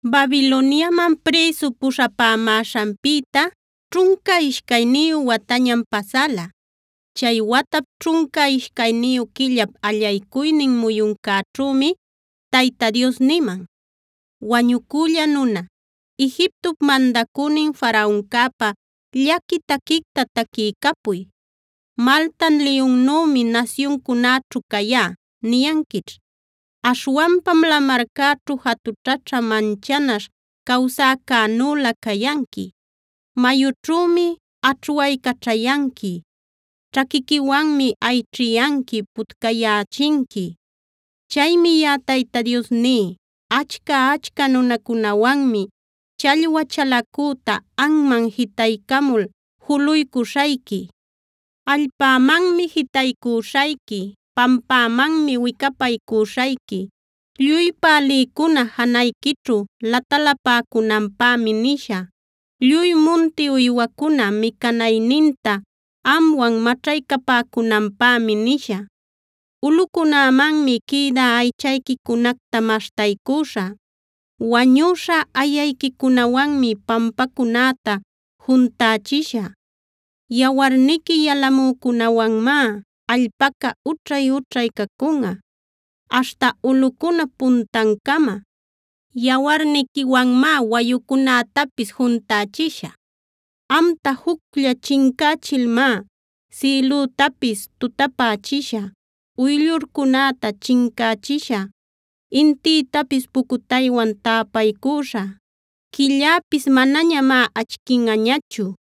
Babiloniaman prïsu puśhapämäśhanpïta ćhunca ishcayniyu watañam pasäla. Chay watap ćhunca ishcayniyu quillap allaycuynin muyuncäćhümi Tayta Dios niman: “Wañucülla nuna, Egiptop mandacünin Faraoncäpa llaqui taquicta taquiycapuy: “ ‘Malta liyunnümi nasyuncunäćhu cayá’ niyanquićh. Aśhwanpam lamarcäćhu jatućhaćha manchanaśh cawsäcänülä cayanqui. Mayućhümi aćhwaycaćhayanqui. Ćhaquiquiwanmi ayćhiyanqui, putcayächinqui. “ ‘Chaymi yaꞌa Tayta Dios ní: Achca-achca nunacunawanmi challwa chalacüta anman jitaycamul juluycuśhayqui. Allpämanmi jitaycüśhayqui; pampämanmi wicapaycüśhayqui. Lluy pälïcuna janayquićhu latalapäcunanpämi nishä; lluy munti uywacuna micanayninta amwan maćhaycapäcunanpämi nishä. Ulꞌucunämanmi quïdä aychayquicunacta maśhtaycüśhä; wañüśha ayayquicunawanmi pampacunäta juntächishä. Yawarniqui yalamücunäwanmá allpaca ućhay-ućhay cacunꞌa aśhta ulꞌucunap puntancama. Yawarniquiwanmá wayucunätapis juntächishä. Amta juclla chincächilmá sïlütapis tutapächishä, uyllurcunäta chincächishä, intïtapis pucutaywan täpaycüśhä, quilläpis manañamá achquinꞌañachu.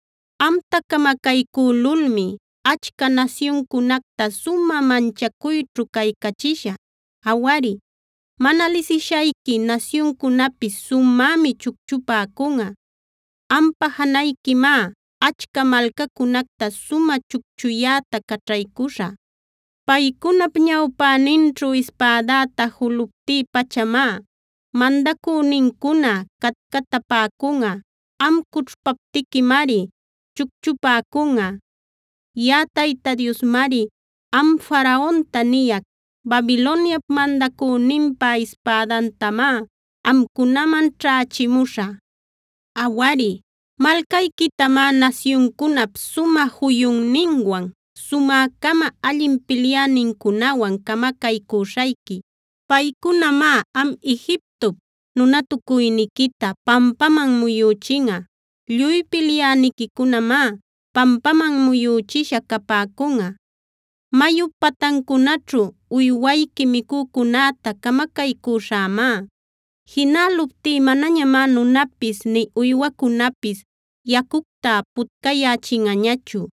“ ‘Amta camacaycülulmi achca nasyuncunacta sumä manchacuyćhu caycachishä. Awari, mana lisishayqui nasyuncunapis sumämi chucchupäcunꞌa. Ampa janayquimá achca malcacunacta sumä chucchuyäta caćhaycuśhä. Paycunap ñawpäninćhu ispädäta juluptï-pachamá mandacünincuna catcatapäcunꞌa. Am cućhpaptiquimari chucchupäcunꞌa. “ ‘Yaꞌa Tayta Diosmari am Faraonta niyac: “ ‘Babiloniap mandacüninpa ispädantamá amcunaman ćhächimuśhä. Awari, malcayquitamá nasyuncunap sumä juyunninwan sumä-cama allin pilyänincunawan camacaycüśhayqui. Paycunamá am Egiptop nunatucuyniquita pampaman muyüchinꞌa. Lluy pilyäniquicunamá pampaman muyüchisha capäcunꞌa. Mayup patancunaćhu uywayqui micücunäta camacaycüśhämá. Jinäluptí manañamá nunapis nï uywacunapis yacucta putcayächinꞌañachu.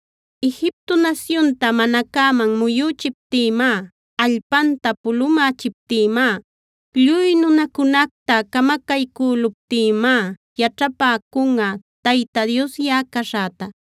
Egipto nasyunta mana cäman muyüchiptïmá, allpanta pulumächiptïmá, lluy nunacunacta camacaycüluptïmá yaćhapäcunꞌa Tayta Dios yaꞌa caśhäta.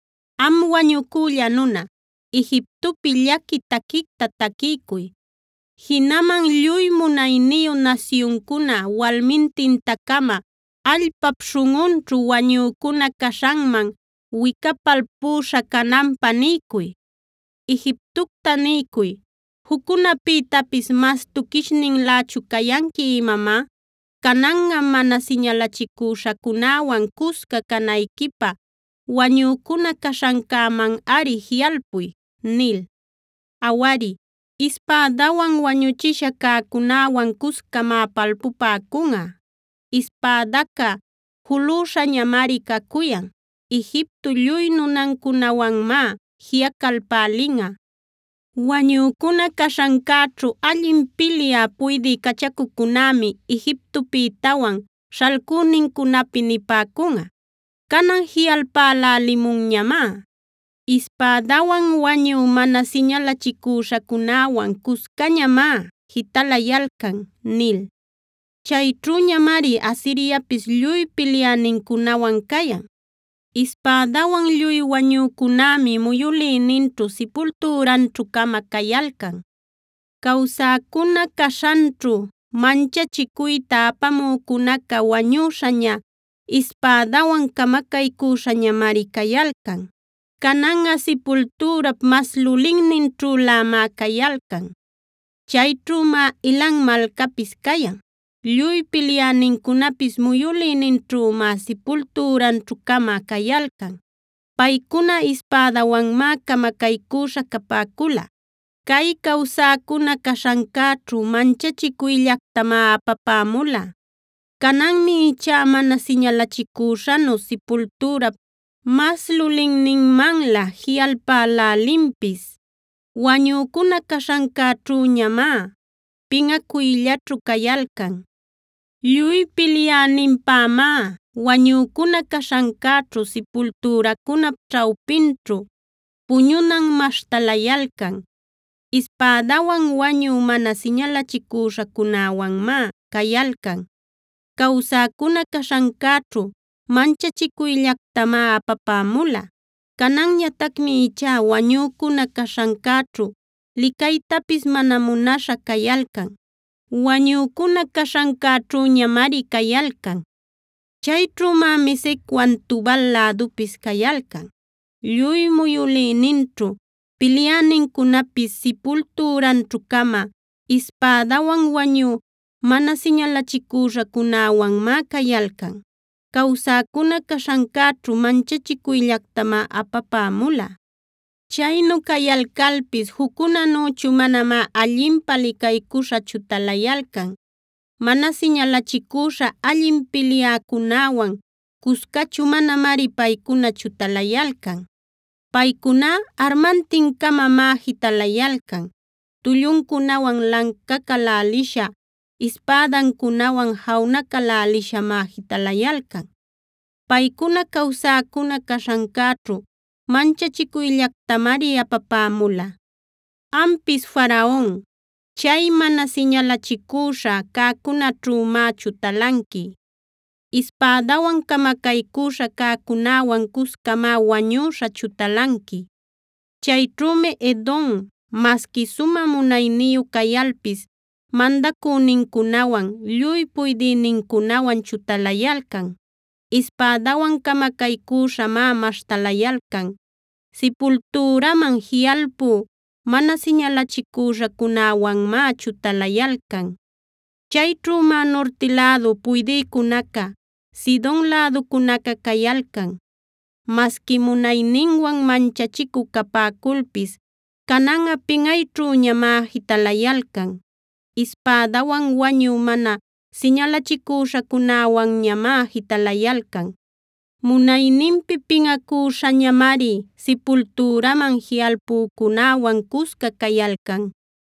“Am wañucülla nuna, Egiptopi llaqui taquicta taquiycuy; jinaman lluy munayniyu nasyuncuna walmintinta-cama allpap śhunꞌunćhu wañücuna caśhanman wicapalpüśha cananpä niycuy. “Egiptocta niycuy: ‘¿Juccunäpïtapis mas tuquishninlächun cayanqui imamá? Cananꞌa mana siñalachicüśhacunäwan cusca canayquipä wañücuna caśhancämanꞌari jiꞌalpuy’ nil. “Awari, ispädawan wañuchisha cäcunäwan cuscamá palpupäcunꞌa. Ispädaca julüśhañamari cacuyan; Egipto lluy nunancunawanmá jiꞌacalpälinꞌa. Wañücuna caśhancäćhu allin pilyä puydï cachacucunämi Egiptopïtawan śhalcünincunapi nipäcunꞌa: ‘Canan jiꞌalpälälimunñamá. Ispädawan wañü mana siñalachicüśhacunäwan cuscañamá jitalayalcan’ nil. “Chayćhüñamari Asiriapis lluy pilyänincunawan cayan. Ispädawan lluy wañücunämi muyülïninćhu sipultüranćhu-cama cayalcan. Cawsäcuna caśhanchu manchachicuyta apamücunaca wañüśhaña, ispädawan camacaycüśhañamari cayalcan. Cananꞌa sipultürap mas lulinninćhülämá cayalcan. “Chayćhümá Elam malcapis cayan. Lluy pilyänincunapis muyülïninćhümá sipultüranćhu-cama cayalcan. Paycuna ispädawanmá camacaycüśha capäcula. Cay cawsäcuna caśhancäćhu manchachicuyllactamá apapämula. Cananmi ichá mana siñalachicüśhanu sipultürap mas lulinninmanlä jiꞌalpälälinpis. Wañücuna caśhancäćhüñamá pinꞌacuyllaćhu cayalcan. “Lluy pilyäninpämá wañücuna caśhancäćhu, sipultüracunap ćhawpinćhu puñunan maśhtalayalcan. Ispädawan wañü mana siñalachicüśhacunäwanmá cayalcan. Cawsäcuna caśhancäćhu manchachicuyllactamá apapämula. Cananñatacmi ichá wañücuna caśhancäćhu licaytapis mana munaśha cayalcan. Wañücuna caśhancäćhüñamari cayalcan. “Chayćhümá Mesecwan Tubal lädupis cayalcan. Lluy muyülïninćhu pilyänincunapis sipultüranćhu-cama, ispädawan wañü mana siñalachicüśhacunäwanmá cayalcan. Cawsäcuna caśhancäćhu manchachicuyllactamá apapämula. Chaynu cayalcalpis juccunänüchu manamá allinpä licaycuśha chutalayalcan; mana siñalachicüśha allin pilyäcunäwan cuscachu manamari paycuna chutalayalcan. Paycuná armantin-camamá jitalayalcan. Tulluncunawan lancacälälisha, ispädancunawan januacälälishamá jitalayalcan. Paycuna cawsäcuna caśhancäćhu manchachicuyllactamari apapämula. “Ampis Faraon, chay mana siñalachicüśha cäcunäćhümá chutalanqui. Ispädawan camacaycüśha cäcunäwan cuscamá wañüśha chutalanqui. “Chayćhümi Edom, masqui sumä munayniyu cayalpis mandacünincunawan, lluy puydïnincunawan chutalayalcan. Ispädawan camacaycüśhamá maśhtalayalcan. Sipultüraman jiꞌalpü mana siñalachicüśhacunäwanmá chutalayalcan. “Chayćhümá nurti lädu puydïcunaca, Sidon läducunaca cayalcan. Masqui munayninwan manchachicü capäculpis cananꞌa pinꞌayćhüñamá jitalayalcan. Ispädawan wañü mana siñalachicüśhacunäwanñamá jitalayalcan. Munayninpi pinꞌacüśhäñamari sipultüraman jiꞌalpucunäwan cusca cayalcan.